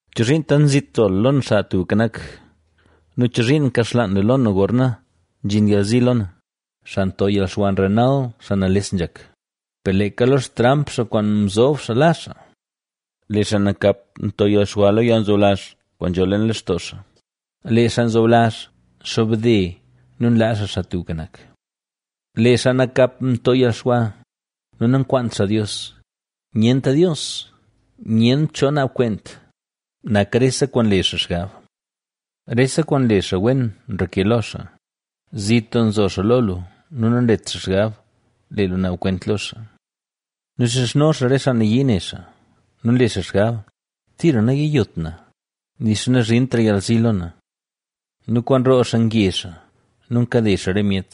¿Chozhiin tant zit nzo lu lo na, Xaa Tubka Nak, nu chozhiin nkaxlaan lu lo na gorna nzhin yalzi lo na? Xaa nto yalxwa nrenal xaa nales nzhak; per leeka lo xtramp xaa kwaan mzob xaa la xaa. Lee xaa nakap nto yalxwa lo yalnzoblazh kwaan nzho leen lextoo xaa, lee xaa nzoblazh nxobde nu nlaa xaa Xaa Tubka Nak. Lee xaa nakap nto yalxwa nu nankwaant xaa Dios: “Nyent Dios, nyent cho naab kwent”, nak rese kwaan nle xaa xgab. Rese kwaan nle xaa wen nreke lo xaa. Zit doo nzo xaa lo lu nu nanlet xaa xgab lee lu naab kwent lo xaa nu xizhno xaa re xaa nayii ne xaa. Nu nle xaa xgab: “Tira nayiyot na; nixa nazhintra yalzi lo na”. Nu kwaan roo xaa nge xaa nu nkade xaa re myet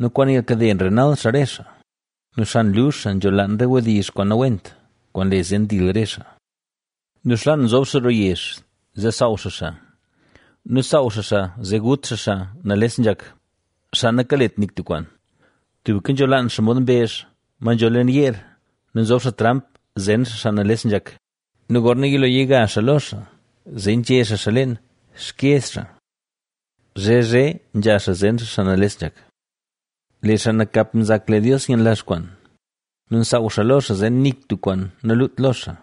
nu kwaan yalkade nrenal xaa re xaa nu xan luzh xaa nzholaan re wdizh kwaan nawent kwaan nle zee ndil re xaa. Nu xlaan nzob xaa roo yezh zee nsaaw xaa xaa nu saaw xaa xaa zee gut xaa xaa nales nzhak, xaa nakalet nik tub kwaan. Tubka nzholaan xaa mod mbezh, ma nzho leen yeer nu nzob xaa tramp zen xaa xaa nales nzhak nu gorna yilo yiga xaa lo xaa zee nzhe xaa xaa leen xkyeez xaa. Zhe zhe nzha xaa zen xaa xaa nales nzhak. Lee xaa nakap nzak lee Dios nyenlazh kwaan; nu nsaaw xaa lo xaa zee nik tub kwaan naluut lo xaa.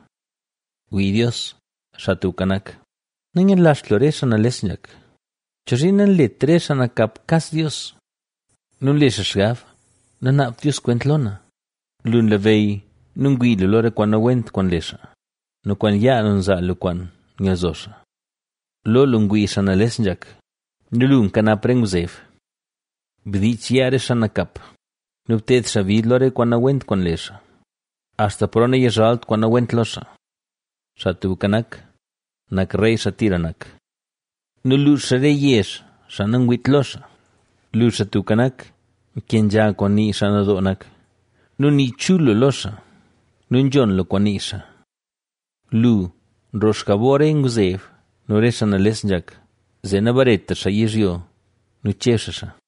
¡Wii Dios, Xaa Tubka Nak! ¡Nayenlazht lu re xaa nales nzhak! ¿Chozhiin nanlet re xaa nakap kas Dios? nu nle xaa xgab: “Nanaabt Dios kwent lo na.” Lu nlabeyy nu ngwii lu lo re kwaan nawent kwaan nle xaa nu kwaan yaa lu zaa lu kwaan yalzo xaa. Lo lu ngwii xaa nales nzhak nu lu nkanap re ngwzeb. ¡Bdiich yaa re xaa nakap nu bted xaa bid lo re kwaan nawent kwaan nle xaa, axta paro nayizhalt kwaan nawent lo xaa. Xaa Tubka Nak, nak rey xaa tira nak nu luux xaa re yezh xaa nangwiit lo xaa. Lu, Xaa Tubka Nak, nkenzha kwaan nii xaa nadoo nak nu nii chul lu lo xaa nu nzhon lu kwaan nii xaa. Lu, nroo xjabor re ngwzeb nu re xaa nales nzhak, zee nabaretra xaa yizhyo nu cheb xaa xaa.